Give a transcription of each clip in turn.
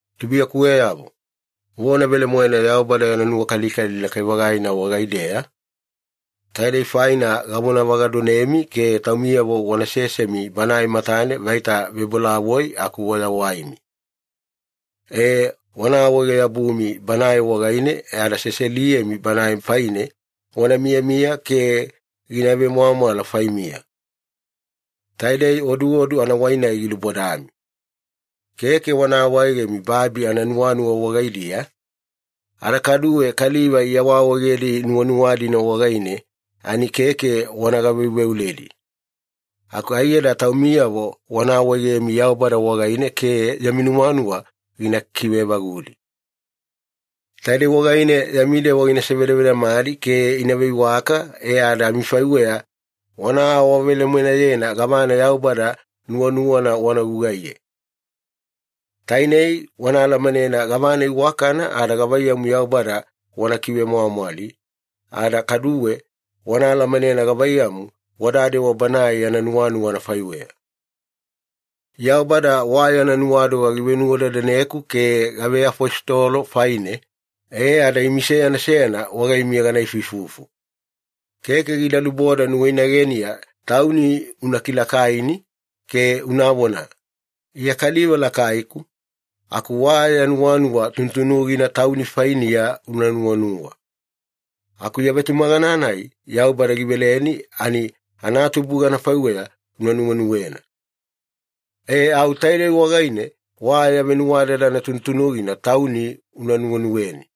Tubuiyakuweyavo, vona velemoena Yaubada yana nuwakalikali lakai-vagaina wagaideya! Taidei faina gavonavagadonemi ke taumiyavo wana sesemi Banae matane vaita vebolavoi aku wayawaimi. E, wana awaege-yabumi Banae wagaine e ada seseliyemi Banae faine wana miyamiya ke gina vemwamwala faimiya. Taidei oduodu anawai-nai gilubodami. Keke wana awaegemi babi ananuwanuwa wagaidiya, ada kaduwe kaliva iawaawaegedi nuwanuwa-dina wagaine ani keke wana gaveuveuledi. Aku aiyada taumiyavo wana awaegemi Yaubada wagaine ke yami nuwanuwa gina kiveevagudi. Taidei wagaine yami dewa gina sevedavedamadi ke ina veiwaka, e ada amifaiweya wana awavelemoenayena gavana Yaubada nuwanuwana wana gugaiye. Tainei, wana alamanena gavana iwakana ada gavaiyamu Yaubada wana kivemwamwali, ada kaduwe wana alamanena gavaiyamu wanadewa Banae yana nuwanuwa anafaiweya. Yaubada wa yana nuwadoga givenuwadadaneku ke gaveafositolo faine, e ada imi seyana seyana wagaimiya gana ifuifufu. Keke gida luboda nuwainageniya tauni una kilakaini ke unavona, “Iya kaliva lakaiku,” aku wa ya nuwanuwa tunutunugina tauni fainiya una nuwanuwa. Aku ya vetumagana-nai Yaubada giveleni ani anatubuga anafaiweya una nuwenuwena. E, au taidei wagaine wa ya venuwadadana tunutunugina tauni una nuwenuweni.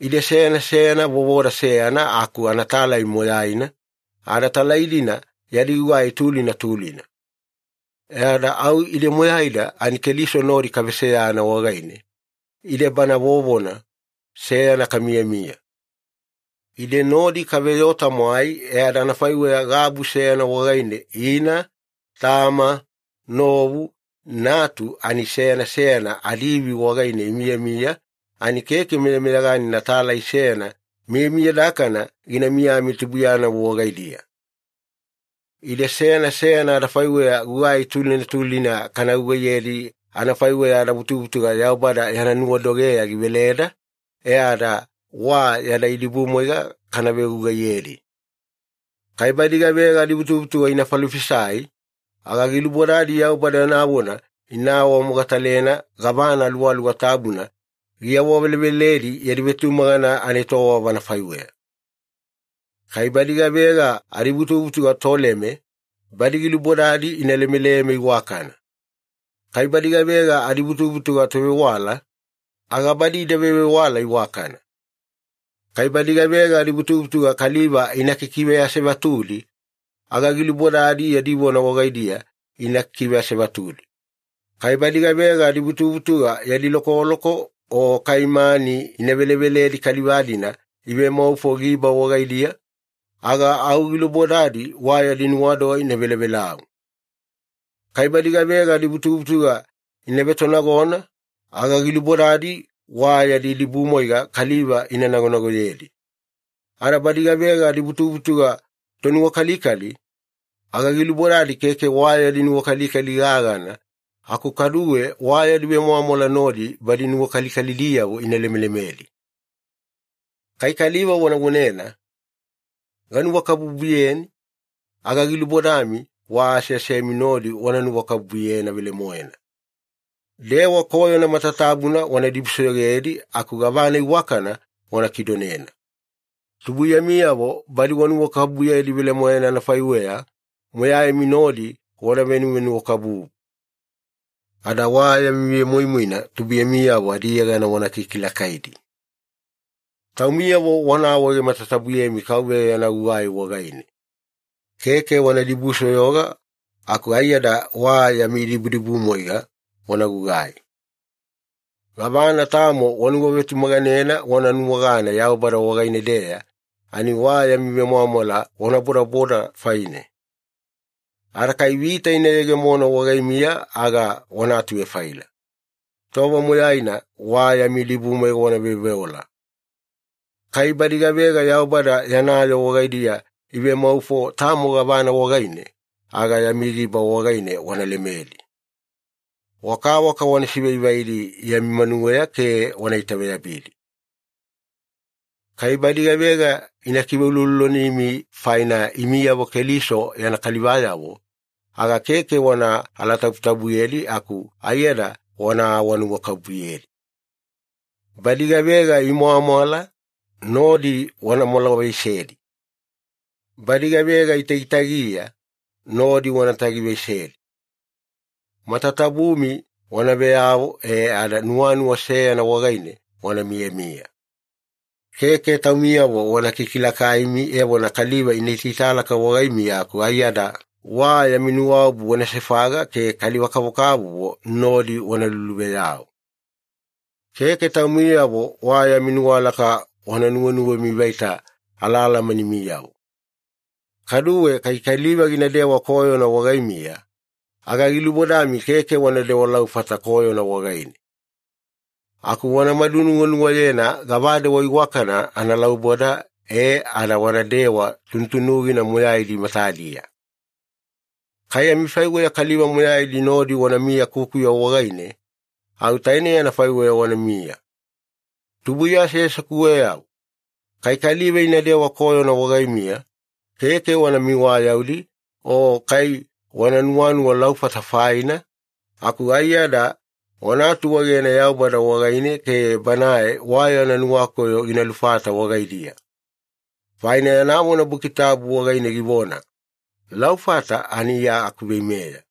Ide seyana seyana vovoda seyana aku anatalai moyaina, ada talai-dina yadi gugai tulina tulina. E ada au ide moyaida ani Keliso nodi kaveseyana wagaine, ide Bana vovona seyana kamiyamiya. Ide nodi kaveyoo-tamwai e ada anafaiweya gabu seyana wagaine ina, tama, novu, natu ani seyana seyana adiivi wagaine imiyamiya ani keke meyameyaganina talai seyana miyamiyadakana gina miyamiya tubuiyanavo wagaidiya. Ide seyana seyana adafaiweya gugai tulina tulina kana gugaiyedi anafaiweya adavutuvutuga Yaubada yana nuwadogeya giveleda, e ada wa yada idibumwaiga kana vegugaiyedi. Kai badi gavega adivutuvutuga ina falofisai, aga gilubodadi Yaubada yana vona ina awamogatalena gavana Aluwaluwa Tabuna giawaveleveledi yadi vetumagana anaetowava anafaiweya. Kai badi gavega adivutuvutuga toleme, badi gilubodadi ina lemeleme iwakana. Kai badi gavega adivutuvutuga tovewala, aga badi ida vevewala iwakana. Kai badi gavega adivutuvutuga kaliva ina kikiveasevatudi, aga gilubodadi yadi vona wagaidiya ina kiveasevatudi. Kai badi gavega adivutuvutuga yadi lokoloko o kai mani ina veleveledi kaliva-dina ivemaufo giba wagaidiya, aga au gilubodadi wa yadi nuwadoga ina velavelau. Kai badi gavega adivutuvutuga ina vetonagona, aga gilubodadi wa yadi idibumwaiga kaliva ina nagonagoyedi. Ada badi gavega adivutuvutuga tonuwakalikali, aga gilubodadi keke wa yadi nuwakalikali gagana aku kaduwe wa yadi vemwamwala nodi badi nuwakalikalidiyavo ina lemelemedi. Kai kaliva wana vonena, “Ganuwakabubuyeni,” aga gilubodami wa aseasemi nodi wana nuwakabubuyena velemoena. Dewa koyona matatabuna wana dibusoyogedi aku gavana iwakana wana kidonena. Tubuiyamiyavo badi wanuwakabubuyedi velemoena anafaiweya, moyaimi nodi wana venuwanuwakabubu. Ada wa yami vemoimoina tubuiyamiyavo adiyegana wana kikilakaidi. Taumiyavo wana awaege matatabuyemi Kauveya yana gugai wagaine. Keke wana dibusoyoga aku aiyada wa yami idibudibumwaiga wana gugai. Gavana tamo wanuwavetumaganena wana nuwagana Yaubada wagaine-deya ani wa yami vemwamwala wana bodaboda faine. Ada kai vita ina yegemona wagaimiya aga wana atuvefaila. Tova moyaina wa yami idibumwaiga wana veoveola. Kai badi gavega Yaubada yana yoo wagaidiya ivemaufo tamo gavana wagaine, aga yami giba wagaine wana lemedi. Wakawaka wana sivaivaidi yami manuweya ke wana itaveyabidi. Kai badi gavega ina kiveuloulolonimi faina imiyavo Keliso yana kalivayavo, aga keke wana alatabutabuyedi aku aiyada wana awanuwakabubuyedi. Badi gavega imwamwala, nodi wana mwalavaisedi. Badi gavega itagitagiya, nodi wana tagiyavaisedi. Matatabumi wana veyavo e ada nuwanuwa seyana wagaine wana miyamiya. Keke taumiyavo wana kikilakaimi evona kaliva ina itaitalaka wagaimiya aku aiyada wa yami nuwaobu wana sefaga ke kaliva-kavokavovo nodi wana luluveyau. Keke taumiyavo wa yami nuwalaka wana nuwenuwemi vaita alaalamanimiyavo. Kaduwe, kai kaliva ginadewa koyona wagaimiya, aga gilubodami keke wanadewa laufata koyona wagaine. Aku wanamadu nuwanuwayena gavadewa iwakana analauboda e ada wanadewa tunutunugina moyaidi matadiya. Kai amifaiweya kaliva moyaidi nodi wanamiya kukuya wagaine, au tainei anafaiweya wanamiya. Tubuiya aseasekuweyavo, kai kaliva inadewa koyona wagaimiya, keke wana miwayaudi o kai wana nuwanuwa laufata faina, aku aiyada wana atuegena Yaubada wagaine ke Banae wa yana nuwakoyo gina lufata wagaidiya. Faina yana vona Buki Tabu wagaine givona, “Laufata ani Iya akuveimeya.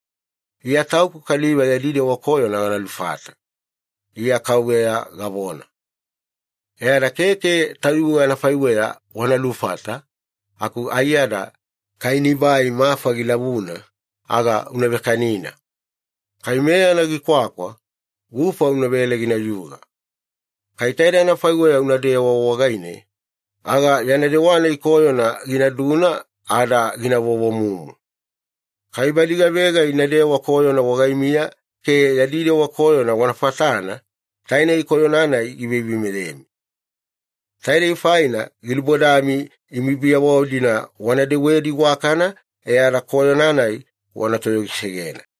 Iya Tauku kaliva yadi dewa koyona gana lufata. Iya KAUVEYA gavona.” E ada keke tayuwe anafaiweya wana lufata, aku aiyada “Kai nibai mafa gilavuna, aga una vekanina. Kai meyana gikwakwa, gufa unavele ginayuga. Kai taidei anafaiweya unadewa wagaine, aga yana dewa-nai koyona ginaduna ada gina vovomumu.” Kai badi gavega inadewa koyona wagaimiya ke yadi dewa koyona wana fatana, tainei koyona-nai giveiveimeyemi. Taidei faina gilubodami imi biyavo-dina wana dewedi iwakana e ada koyona-nai wana toyogisegena.